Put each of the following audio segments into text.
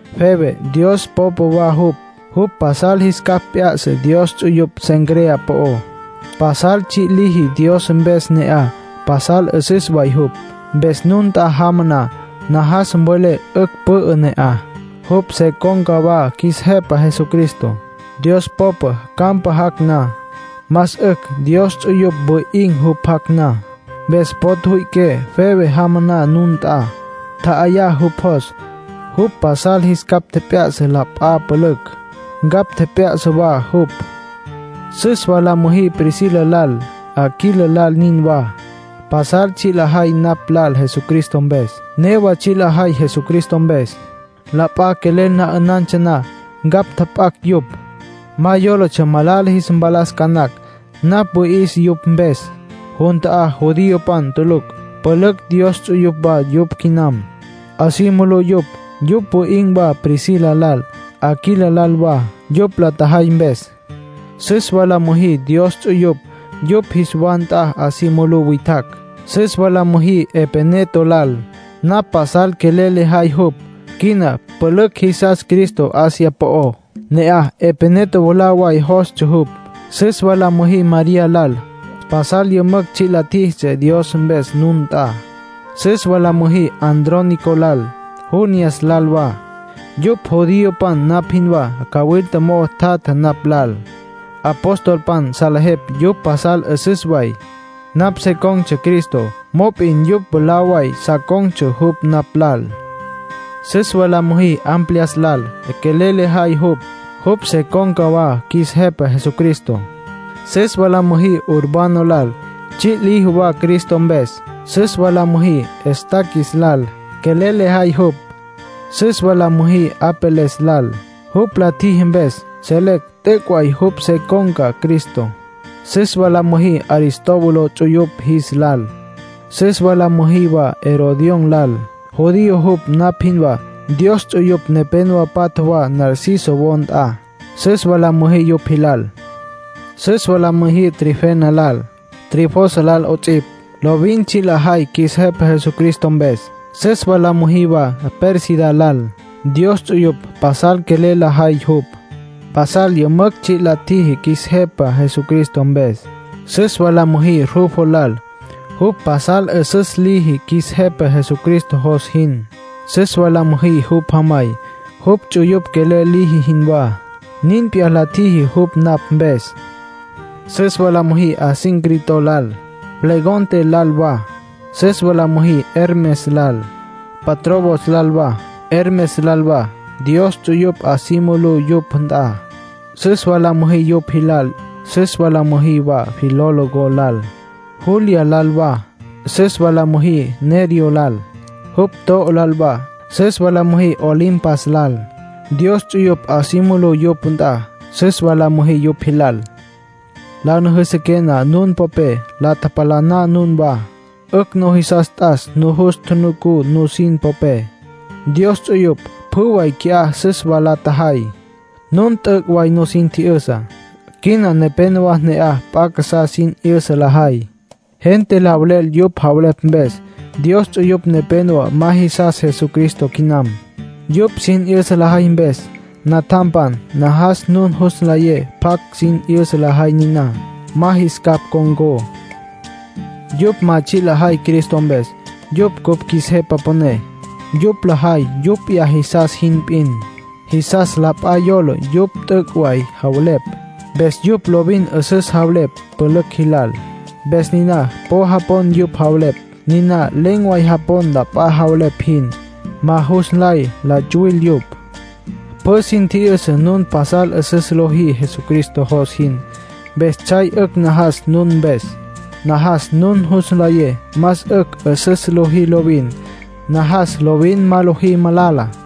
Febe Dios popa wa jupj. Jupj pasal jis capj p'ya'sa Dios ts'uyupj Cencrea po'ó. Pasal tsji' liji Dios mpes ne'aj. Pasal 'üsüs way jupj. Mpes nun nt'a jama na, najas mvelé 'ücj pü'ü ne'aj. Jupj se con̈ca wa qjuis Jepa Jesucristo. Dios popa campa jac' na, más 'ücj Dios ts'uyupj wi'in̈ jupj jac' na. Mpes po tjüwüi'iqué Febe jama na nun nt'a. Tja'ayá jupj jos; jupj pasal jis capj tjep'ya'sa la p'a pülücj. Ncapj tjep'ya'sa wa jupj. Süs wa la müjí Priscila lal, Aquila lal nin wa. Pasal tsji' la tjajay napj lal Jesucristo mpes. Newa tsji' lajay Jesucristo mpes. La p'a quelel na 'ünantsja na, ncapj tjap'acj yupj. Ma yólatsja malala jis mpalas ca nacj. Napj wüi'is yupj mpes. Jun ta'á judiopan tulucj pülücj Dios ts'uyupj wa yupj quinam. 'A si mulú yupj. Yupj wi'in̈ wa Priscila lal, Aquila lal wa, yupj la tjajay mpes. Süs wa la müjí Dios ts'uyupj yupj jis wa nt'a 'a si mulú witjacj. Süs wa la müjí Epeneto lal. Napj pasal quelel lejay jupj. Quina pülücj jisas Cristo Asia po'ó. Ne'aj Epeneto mwalá way jostsja jupj. Süs wa la müjí María lal. Pasal yümücj tsji' la tjíjitsja Dios mpes nun nt'a. Süs wa la müjí Andrónico lal, Junías lal wa. Yupj judiopan napj jinwá. Cawilta mo'o tjatja napj lal. Apostolpan salejepj yupj pasal 'üsüs way. Napj se con̈ Cristo, mop'in yupj mwalá way sa con̈tsja jupj napj lal. Süs wa la müjí Amplias lal. Quelel lejay jupj. Jupj se con̈ca wa qjuis Jepa Jesucristo. Süs wa la müjí Urbano lal. Tsji' liji wa Cristo mpes. Süs wa la müjí Estaquis lal. Quelel lejay jupj. Süs wa la müjí Apeles lal. Jupj la tjiji mpes, selecj t'üc' way jupj se con̈ca Cristo. Süs wa la müjí Aristóbulo ts'uyupj jis lal. Süs wa la müjí wa Herodión lal. Judío jupj napj jinwá. Dios ts'uyupj nepénowa patja wa Narciso wo nt'a. Süs wa la müjí yupj jilal. Süs wa la müjí Trifena lal, Trifosa lal 'ots'ipj. Lovin tsji' lajay qjuis Jepa Jesucristo mpes. Süs wa la müjí wa Pérsida lal. Dios ts'uyupj pasal quelel lajay jupj. Pasal yümücj tsji' la tjiji qjuis Jepa Jesucristo mpes. Süs wa la müjí Rufo lal. Jupj pasal 'üsüs liji qjuis Jepa Jesucristo jos jin. Süs wa la müjí jupj jamay. Jupj ts'uyupj quelel liji jinwá, nin p'iyá la tjiji jupj napj mpes. Süs wa la müjí Asíncrito lal, Flegonte lal wa. Süs wa la müjí Hermes lal, Patrobos lal wa, Hermas lal wa. Dios ts'uyupj 'a si mulú yupj nt'a. Süs wa la müjí yupj jilal. Süs wa la müjí wa Filólogo lal, Julia lal wa. Süs wa la müjí Nereo lal, jupj to'o lal wa. Süs wa la müjí Olimpas lal. Dios ts'uyupj 'a si mulú yupj nt'a. Süs wa la müjí yupj jilal. La nüjüsüqué na nun popé, la tjalapaná nunwá. 'Ücj nujisas t'as nujus tjunucú nusin popé. Dios ts'uyupj pjü way qui'á süs wa la tjajay. Nun t'üc' way nusin tji'yüsa. Quina nepénowa ne'aj p'a casá sin 'yüsa lajay. Gente la velel yupj javelepj mpes. Dios ts'uyupj nepénowa ma jisas Jesucristo quinam, yupj sin 'yüsa lajay mpes. Natjampan, najas nun jus nlayé pjacj sin 'yüsa lajay niná. Ma jis capj ncon̈có. Yupj ma tsji' lajay Cristo mpes, jupj cupj qjuis Jepa Püné. Yupj lajay yupj p'iyá jisas jin p'in. Jisas la p'a yola yupj t'üc' way javelepj. Mpes yupj lovin 'üsüs javelepj pülücj jilal. Mpes niná po japon yupj javelepj. Niná len̈ way japon la p'a javelepj jin. Ma jus nlay la tsuwil yupj. Pjü sin tji'yüsa nun pasal 'üsüs lojí Jesucristo jos jin. Mpes tsjay 'ücj najas nun mpes. Najas nun jus nlayé más 'ücj 'üsüs lojí lovin. Najas lovin ma lojí malala.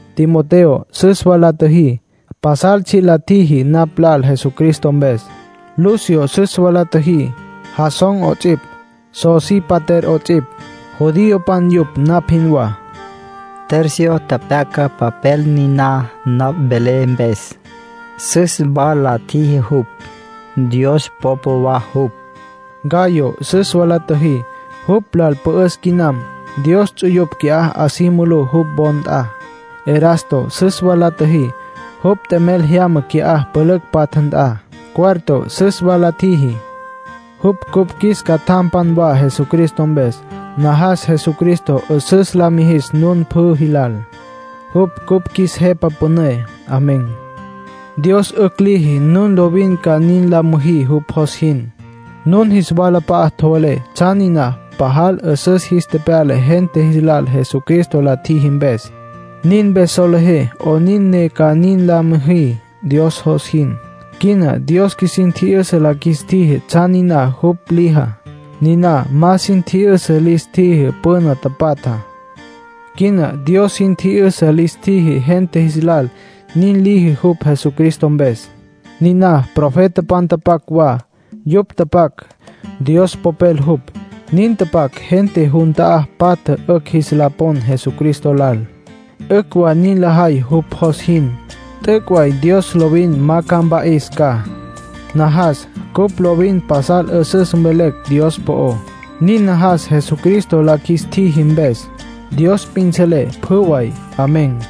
Timoteo süs wa la tjiji. Pasal tsji' la tjiji napj lal Jesucristo mpes. Lucio süs wa la tjiji, Jasón 'ots'ipj, Sosípater 'ots'ipj. Judiopan yupj napj jinwá. Tercio pyaca papel niná napj velé mpes. Süs wa la tjiji jupj. Dios popa wa jupj. Gayo süs wa la tjiji. Jupj lal pü'üs quinam. Dios ts'uyupj qui'á 'a si mulú jupj wo nt'a. Erasto süs wa la tjiji. Jupj t'emel jyama qui'á pülücj patja nt'a. Cuarto süs wa la tjiji. Jupj cupj qjuis catjam wa Jesucristo mpes. Najas Jesucristo 'üsüs la mijis nun pjü jilal. Jupj cupj qjuis Jepa Püné. Amén. Dios 'ücj liji nun lovin ca nin la müjí jupj jos jin. Nun jis walap'a'a tjevelé tsjan niná pajal 'üsüs jis tepyala gente jis lal Jesucristo la tjiji mpes. Nin mpes solejé 'onin ne ca nin la müjí Dios jos jin. Quina Dios qjuisin tji'yüsa la qjuis tjiji tsjan niná jupj lijá. Niná ma sin tji'yüsa lis tjiji püna tapatjá. Quina Dios sin tji'yüsa lis tjiji gente jis lal nin liji jupj Jesucristo mpes. Niná profetapan nin tapac wa. Yupj tapac, Dios Popel jupj. Nin tapac gente jun ta'á patja 'ücj jis la pon Jesucristo lal. 'Ücj wa nin lajay jupj jos jin. T'üc' way Dios lovin ma mpa'is ca. Najas cupj lovin pasal 'üsüs mvelecj Dios po'ó. Nin najas Jesucristo la qjuis tjiji mpes. Dios p'in selé pjü way. Amén.